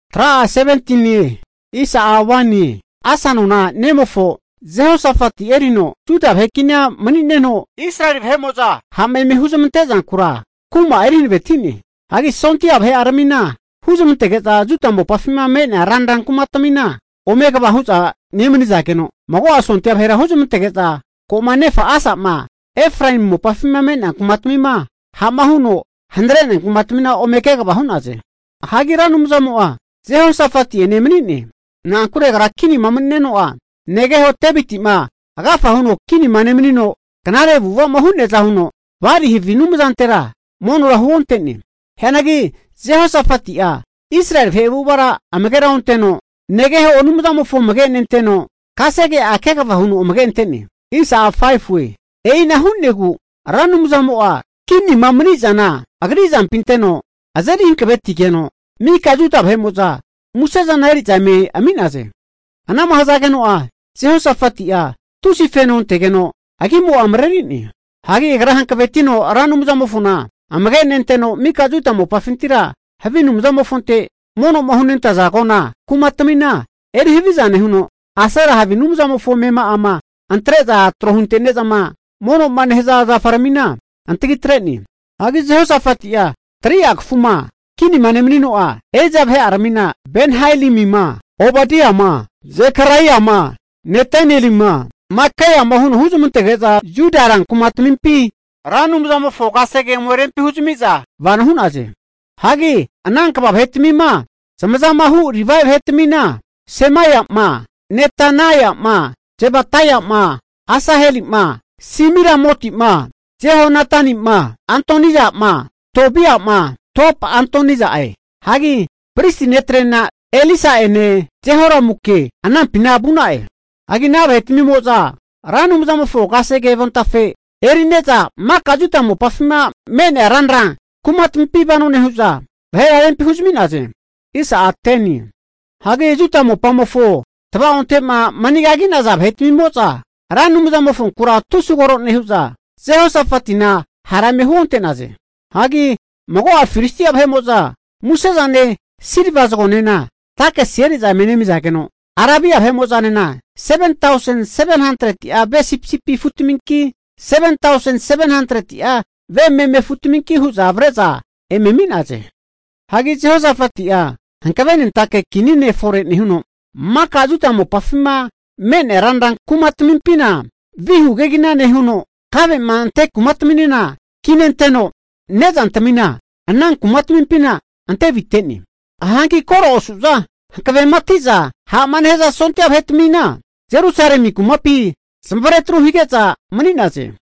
Hagi Asa nona nemofo Jehosafati erino Juda vahe kinia mani'neno, Israeli vahe'mo'za ha'ma eme huzmante zankura kuma'a eri hankaveti'ne. Hagi sondia vahe'aramina huzmantege'za Juda mopafima me'nea ranra kumatmina ome kva hu'za nemani'zageno, mago'a sondia vahera huzmantege'za ko'ma nefa Asa'ma Efraemu mopafi me'nea kumatmima ha'ma huno hanare'nea kumatamina ome kegava hu'naze. Hagi Ra Anumzamo'a Jehosafeti'ene mani'ne. Na'ankure agra kinima nemanino'a, negeho Deviti'ma agafa huno kinima nemanino knare avu'ava'ma hu'neaza huno, Bali havi anumzantera monora huonte'ne. Hianagi Jehosafati'a Israeli vahe avu'avara amagera onteno, negeho Anumzamofo amage'nenteno kasege'a kegava huno amage'ante'ne. E'ina hu'negu Ra Anumzamo'a kinima mani'zana agri azampi anteno azeri hankavetigeno, mika Juda vahe'mo'za musezana eri'za eme ami'naze. Ana'ma hazageno'a Jehosafati'a tusi feno antegeno, agimo'a mareri'ne. Hagi agra hankvetino Ra Anumzamofona amage'nenteno mika Juda mopafintira havi anumzamofonte mono'ma hunentaza agona kumatmina erihaviza nehuno, Asera havi anumzamofo amema'ama antre'za tro huntene'zama mono'ma nehaza zafaramina antagi atre'ne. Hagi Jehosafati'ma 3'a kafuma kinima nemanino'a, eri'za vahe'aramina Ben-hailimima, Obadiama, Zekaraiama, Netanelima, Makaiama huno huzmantege'za, Juda rankumatamimpi Ra Anumzamofo kasege ome rempi huzami'za vano hu'naze. Hagi ana kva vahetamima zmazamahu Livae vahetmina, Semaia'ma, Netanaia'ma, Zebadaia'ma, Asaheli'ma, Semiramoti'ma Jehonatani'ma, Adonija'ma, Tobia'ma, Tob-Adonija'e. Hagi pristi netre'na Elisa'ene Jehoramuke anampina vu'na'e. Hagi ana vahetmimo'za Ra Anumzamofo kasege avontafe eri'neza maka Juda mopafima me'nea ranra kumatamimpi vano nehu'za, vahera rempi huzmi'naze. Hagi Juda mopamofo tavaonte'ma manigagi'naza vahetmimo'za Ra Anumzamofonkura tusi koro nehu'za, Jehosafatina hara eme huonte'naze. Hagi mago'a Filistia vahe'mo'za musezane silva zagonena takisi eri'za eme nemizageno, Arabia vahe'mo'zanena 7tausen 700'a ve sipisipi afutminki, 7tausen 700'a ve meme afutminki hu'za avre'za eme ami'naze. Hagi Jehosafati'a hankavenentake kini fore nehuno, maka Juda mopafima me'nea ranra kumatamimpina vihu kegina nehuno, kave'ma ante kumataminena kinenteno, nezantmina ana kumatmimpina ante avitente'ne. Hagi koro osu'za hankavematiza ha'ma nehaza sondia vahetmina, Jerusalemi kumapi zamavare atru hige'za mani'naze.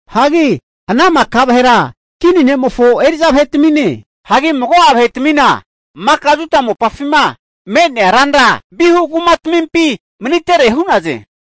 Hagi ama ana maka vahera kini ne'mofo eri'za vahetamine. Hagi mago'a vahetmina maka Juda mopafima me'nea ranra vihu kumatmimpi manitere hu'naze.